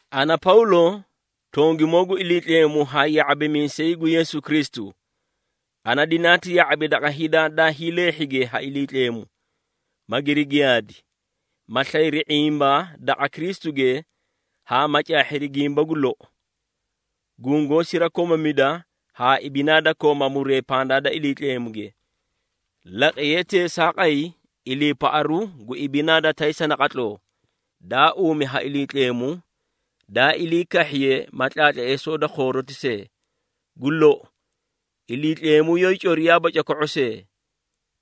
Ana Pawlo, tongimoo gu Iliitleemu haa ya⁄abimiisay gu Yeesu Kristu, ana dinaati ya⁄abi daqa hida daa hiileehhige ha Iliitleemu, magiri giyaadi, ma slayri ⁄imba daqa Kristuge haa ma caahhiri gimba gu lou, gungoó sirakomamida haa ibinaa da kooma muree pandaa da Iliitleemuge. Laqiyee teesaaqay iliipaꞌaru gu ibinaa da taysa naqatloo, daa uumi ha Iliitleemu, daa ilii kahhiye ma tlaatleesoo da khooroti see. Gu lou, Iliitleemu yoóyii coriyaaba coko⁄o see!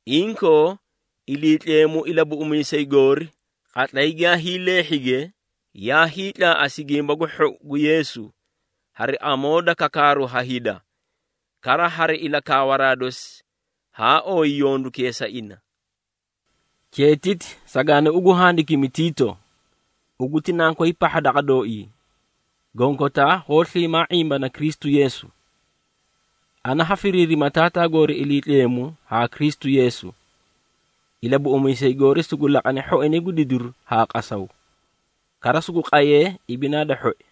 Inkoo Iliitleemu Ilabuꞌumiisay goori, qatlay giyaa hiileehhige, yaa hiitlaaꞌasi Gimba gu Hhou gu Yeesu, hari amoo da kakaaru ha hida. Kara hari ilakaawaraa dosi haa ooyi yondukee sa ina. Cheetiti sagaani ugu handikimi, Tiito, ugu ti nankoy pahha daqa dooii, gonkotaa hoó sliimaa ⁄imbana Kristu Yeesu. Ana ha firiirima Taataa goori Iliitleemu haa Kristu Yeesu, Ilabuꞌumiisay goori sugu laqane hhoinay gu didiru haa qasaw, kara sugu qayee ibinaa da hhoi.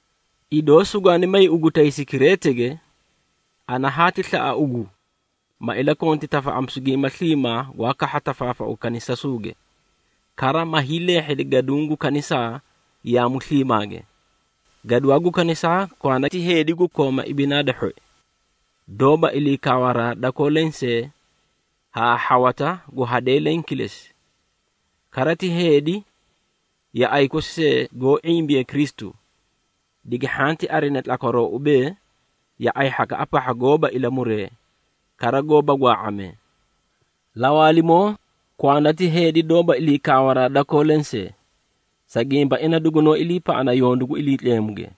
Idoo sugwaa may ugu taysi Kireetege, ana haati slaꞌa ugu, ma ilakonti tafaꞌamisu gimba sliimaa gwaa kahha tafaafau kanisasuuge, kara ma hiileehhedi gaduũ gu kanisaa yaamu sliimaage. Gaduwaa gu kanisaa kwanda ti heedi gu kooma ibinaa da hhoi, doóba ilii kaawaraa dakoo lensee haa hhawata gu hadee leẽ kilesi. Kara ti heedi yaꞌay kosi see goó ⁄imbee Kristu, digi hhanti arina tlakwaroo ubee, yaꞌay hhakaꞌa pahha goóba ilamuree, kara goóba gwaa⁄amee. Lawaalimoo kwanda ti heedi doóba ilii kaawaraa dakoo lensee, sa gimba ina dugunoó iliipaꞌana yondu gu Iliitleemuge.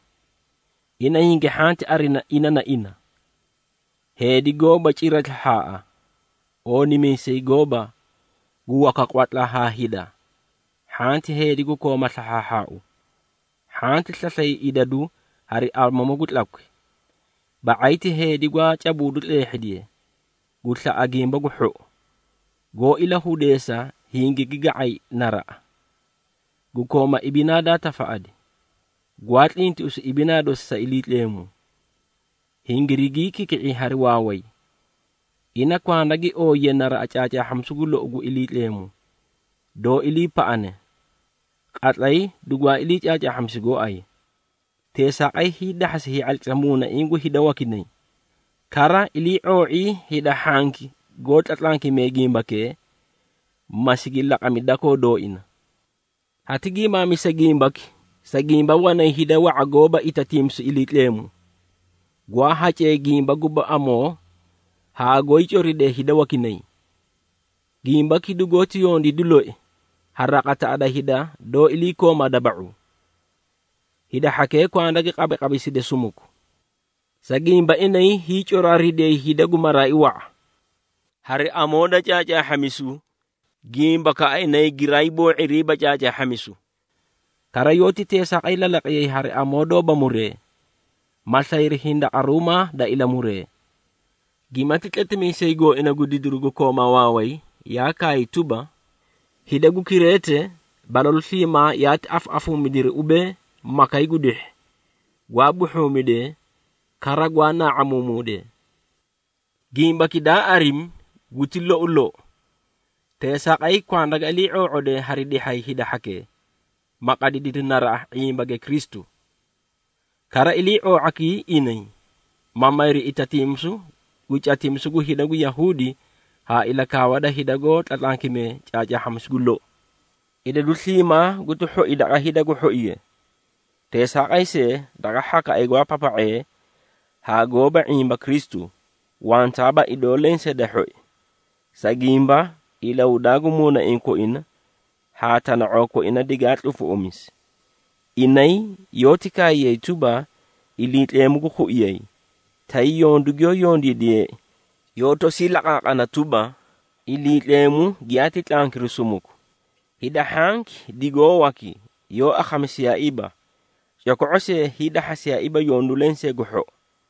Ina hingi hhanti arina ina na ina, heedi goóba cira slahhaaꞌa, oonimiisay gooba, gu waka qwatla haa hida, hhanti heedi gu kooma slahhaahhaau, hhanti slaslay idadu hari amamu gu tlakwi. Ba⁄ay ti heedi gwaa cabuudu tleehhidiye, gu slaꞌa gimba gu hhou, goó ilahudeesa hingigi ga⁄ay naraꞌa, gu kooma ibinaa daa tafaꞌadi, gwaa tlintiꞌisu ibinaa dosi sa Iliitleemu, hingirigii kiki⁄i hari waaway. Ina kwanda gi ooyiye naraꞌa caacaahhamisu gu lou gu Iliitleemu, doó iliipaꞌane, qatlay dugwaa ilii caacaahhamisi gooay. Teesaaqay hiidahhasi hii⁄atlisa muunaiĩ gu hida wakinay, kara ilii⁄oo⁄ii hida hhanki goó tlatlankimee gimbakee, ma sigi laqami dakoo dooina. Hati gimaamisa gimbaki, sa gimba wanay hida wa⁄a goóba itatiimisu Iliitleemu, gwaa hacee gimba guba amoo haa goóyii coridee hida wakinay. Gimbaki dugoóti yondiidi loi ha raqataꞌa da hida doó iliikooma daba⁄u. Hida hhakee kwanda gi qabiqabiside sumuku, sa gimba inay hiicoraaridiyay hida gu maraai wa⁄a, hari amoo da caacaahhamisu, gimbakaꞌa inay giraa hiiboo⁄iriiba caacaahhamisu. Kara yoóti teesaaqay lalaqiyay hari amoo doóba muree, ma slayri hindaqaruumaa da ilamuree. Gimati tletimiisay gooina gu didiri gu kooma waaway yaa kaay tuba, “Hida gu Kireete balalu sliimaa yaati afaꞌafuumidiri ubee, makay gu dihhi, gwaa buhhuumidee, kara gwaa naa⁄amuumuudee.” Gimbaki daa arimi guti lou lou. Teesaaqay kwanda ga ilii⁄oo⁄odee hari dihhay hida hhakee, ma qadidiri naraꞌa ⁄imbage Kristu. Kara ilii⁄oo⁄akii inay, ma mayri itatiimisu gu catimisu gu hida gu Yahuudi haa ilakaawa da hida goó tlatlankimee caacaahhamisu gu lou. Idadu sliimaa guti hhoi daqa hida gu hhoige. Teesaaqay see, daqa hhakaꞌay gwaa papa⁄ee haa goóba ⁄imba Kristu, wantaaba idoo lensee da hhoi. Sa gimba, ilahudaa gu muunaiĩ koina haa tana⁄oo koina digaa tlufuꞌumisi. Inay yoóti kaayay tuba, Iliitleemu gu khuiyay, tay yondu giyoó yondiidiyeei, yoó tosii laqaaqana tuba, Iliitleemu giyaati tlankiri sumuku. Hida hhanki digoó waki, yoó akhamisiyaaiiba, coko⁄o see hiidahhasiyaaiiba yondu lensee gu hhou.